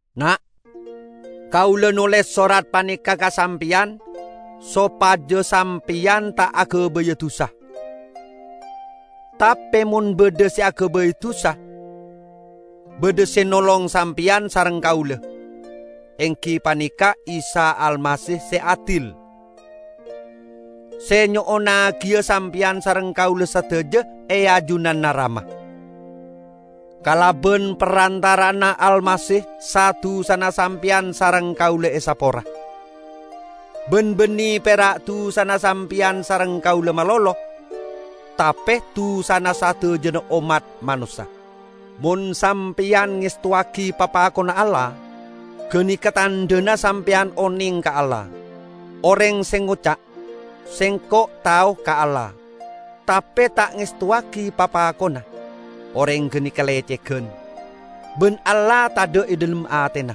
Na'! Kaula noles sorat paneka ka sampeyan, sopaja sampeyan ta' agabaya dusa. Tape mon badha se agabay dusa, badha se nolong sampeyan sareng kaula, enggi paneka Isa Almasih se adil; se nyo'onnagiya sampeyan sareng kaula sadaja e ajunanna Rama. Kalaban parantara'anna Almasih sa-dusana sampeyan sareng kaula esapora; ban banne pera' dusana sampeyan sareng kaula malolo, tape dusana sadajana ommat manossa. Mon sampeyan ngestowagi papakonna Allah, ganeka tandhana sampeyan oneng ka Allah. Oreng se ngoca', "Sengko' tao ka Allah," tape ta' ngestowagi papakonna, oreng ganeka lecegan, ban Allah tadha' e dhalem atena.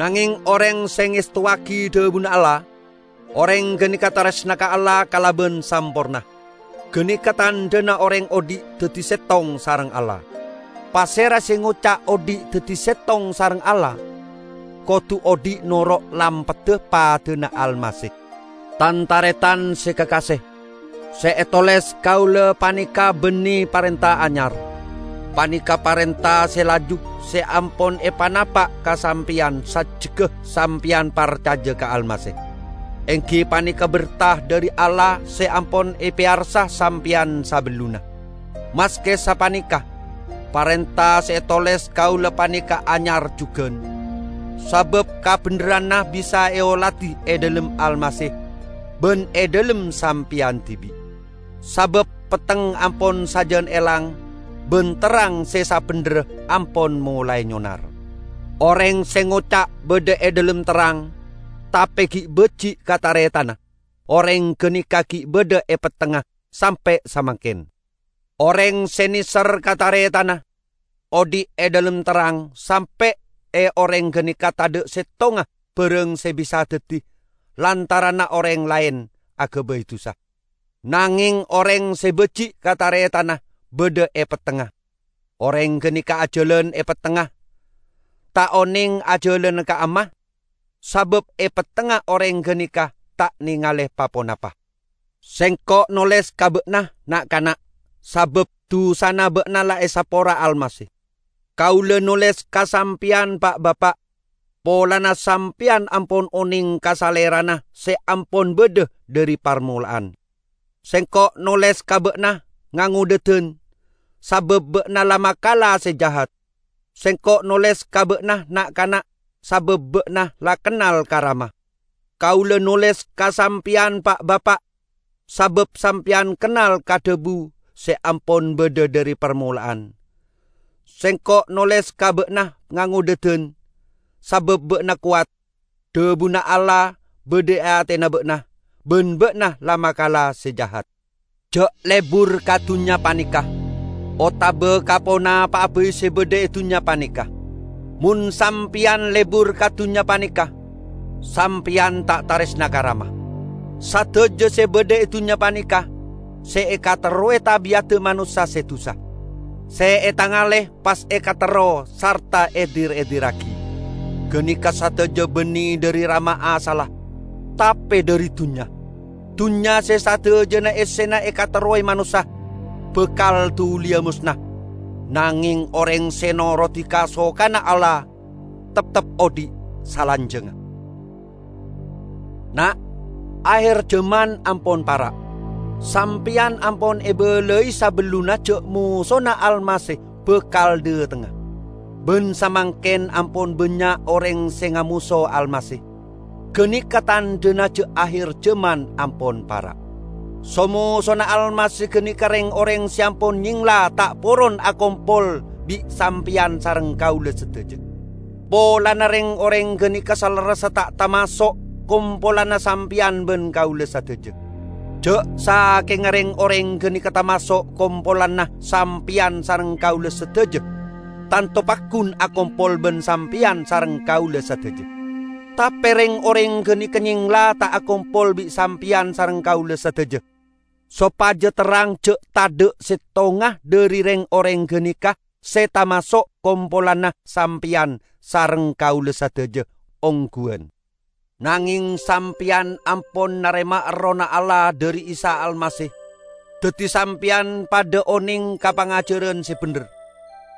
Nangeng oreng se ngestowagi dhabuna Allah, oreng ganeka taresna ka Allah kalaban samporna. Ganeka tandhana oreng odhi' daddi settong sareng Allah. Pasera se ngoca' odhi' daddi settong sareng Allah, kodu odhi' noro' lampadda padana Almasih. Tan-taretan se kakase! Se etoles kaula paneka banne parenta anyar. Paneka parenta se laju se ampon epanapa' ka sampeyan sajjegga sampeyan parcaja ka Almasih; enggi paneka berta dhari Allah se ampon epeyarsa sampeyan sabellunna. Maske sapaneka, parenta se etoles kaula paneka anyar jugan; sabab kabendherranna bisa eoladi e dhalem Almasih ban e dhalem sampeyan dibi'. Sabab petteng ampon sajan elang ban terrang se sabendherra ampon molae nyonar. Oreng se ngoca' badha e dhalem terrang tape gi' baji' ka taretanna, oreng ganeka gi' badha e pettengnga sampe' samangken. Oreng se neser ka taretanna, odhi' e dhalem terrang sampe' e oreng ganeka tadha' settonga barang se bisa daddi lantaranna oreng laen agabay dusa. Nangeng oreng se baji' ka taretanna badha e pettengnga. Oreng ganeka ajalan e pettengnga, ta' oneng ajalana ka'amma, sabab e pettengnga oreng ganeka ta' nengale pa-ponapa. Sengko' noles ka ba'na, na'-kana', sabab dusana ba'na la esapora Almasih. Kaula noles ka sampeyan, Pa'-bapa', polana sampeyan ampon oneng ka Salerana se ampon badha dhari parmola'an. Sengko' noles ka ba'na, ngangodhadan, sabab ba'na la makala Se Jahat. Sengko' noles ka ba'na, na'-kana', sabab ba'na la kennal ka Rama. Kaula noles ka sampeyan Pa'-bapa', sabab sampeyan kennal ka Dhabu se ampon badha dhari parmola'an. Sengko' noles ka ba'na, ngangodhadan, sabab ba'na kowat. Dhabuna Allah badha e atena ba'na, ban ba'na la makala Se Jahat. Ja' lebur ka dunnya paneka, otaba ka ponapa'a bai se badha e dunnya paneka. Mon sampeyan lebur ka dunnya paneka, sampeyan ta' taresna ka Rama. Sadaja se badha e dunnya paneka -- se ekaterrowe tabi'adda manossa se dusa, se etangale pas ekaterro sarta edir-edirragi -- ganeka sadaja banne dhari Rama asalla, tape dhari dunnya. Dunnya se sadajana essena ekaterrowe manossa, bakal duliya mosna. Nangeng oreng se norodi kasokanna Allah, teptep odhi' salanjangnga. Na', aher jaman ampon para'! Sampeyan ampon ebalai sabellunna ja' mosona Almasih bakal dhatengnga; ban samangken ampon bannya' oreng se ngamoso Almasih. Ganeka tandhana ja' aher jaman ampon para'. So-mosona Almasih ganeka reng-oreng se ampon nyengla ta' poron akompol bi' sampeyan sareng kaula sadaja, polana reng-oreng ganeka salerressa ta' tamaso' kompolanna sampeyan ban kaula sadaja. Ja' sakenga reng-oreng ganeka tamaso' kompolanna sampeyan sareng kaula sadaja, tanto paggun akompol ban sampeyan sareng kaula sadaja. Tape reng-oreng ganeka nyengla ta' akompol bi' sampeyan sareng kaula sadaja, sopaja terrang ja' tadha' settonga dhari reng-oreng ganeka se tamaso' kompolanna sampeyan sareng kaula sadaja ongguwan. Nangeng sampeyan ampon narema Errohna Allah dhari Isa Almasih daddi sampeyan padha oneng ka pangajaran se bendher.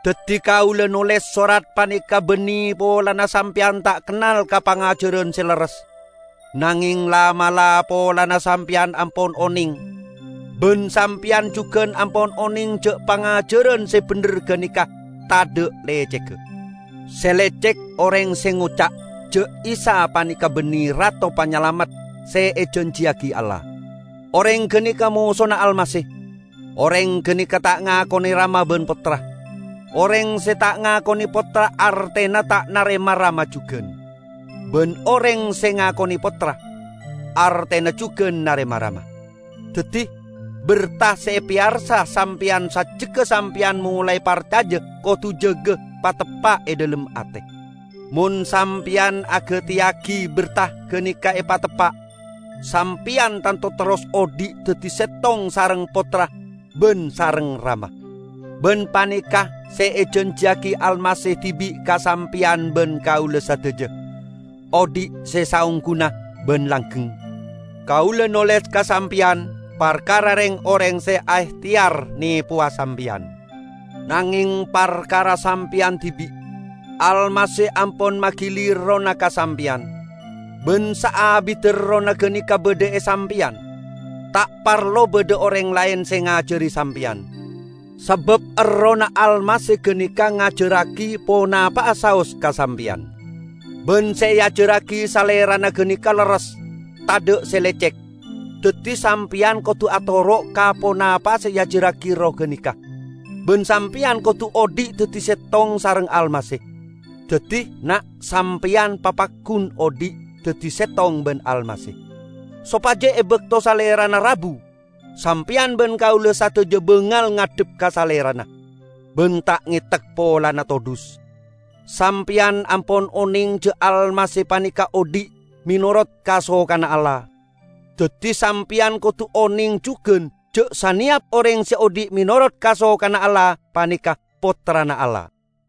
Daddi kaula noles sorat paneka banne polana sampeyan ta' kennal ka pangajaran se lerres, nangeng la'-mala' polana sampeyan ampon oneng, ban sampeyan jugan ampon oneng ja' pangajaran se bendher ganeka tadha' lecegga. Se lecek oreng se ngoca' ja' Isa paneka banne Rato Panyalamet se ejanjiyagi Allah. Oreng ganeka mosona Almasih; oreng ganeka ta' ngakone Rama ban Pottra. Oreng se ta' ngakone Pottra artena ta' narema Rama jugan. Ban oreng se ngakone Pottra, artena jugan narema Rama. Daddi, berta se epeyarsa sampeyan sajjegga sampeyan molae parcaja kodu jaga pateppa' e dhalem ate. Mon sampeyan agateyagi berta ganeka epateppa', sampeyan tanto terros odhi' daddi settong sareng Pottra ban sareng Rama. Ban paneka' se ejanjiyagi Almasih dibi' ka sampeyan ban kaula sadaja: odhi' se saongguna ban langgeng. Kaula noles ka sampeyan parkara reng-oreng se aehteyar nepowa sampeyan. Nangeng parkara sampeyan dibi', Almasih ampon magili Errohna ka sampeyan. Ban saabidda Errohna ganeka badha e sampeyan, ta' parlo badha oreng laen se ngajari sampeyan. Sabab Errohna Almasih ganeka ngajarragi ponapa'a saos ka sampeyan. Ban se eajarragi Salerana ganeka lerres, tadha' se lecek. Daddi sampeyan kodu atoro' ka ponapa se eajarragi Erroh ganeka, ban sampeyan kodu odhi' daddi settong sareng Almasih. Daddi, na', sampeyan papaggun odhi' daddi settong ban Almasih, sopaja e bakto Salerana rabu, sampeyan ban kaula sadaja bangal ngadhep ka Salerana, ban ta' ngetek polana todhus. Sampeyan ampon oneng ja' Almasih paneka odhi' menorot kasokanna Allah. Daddi sampeyan kodu oneng jugan ja' saneyap oreng se odhi' menorot kasokanna Allah paneka pottrana Allah.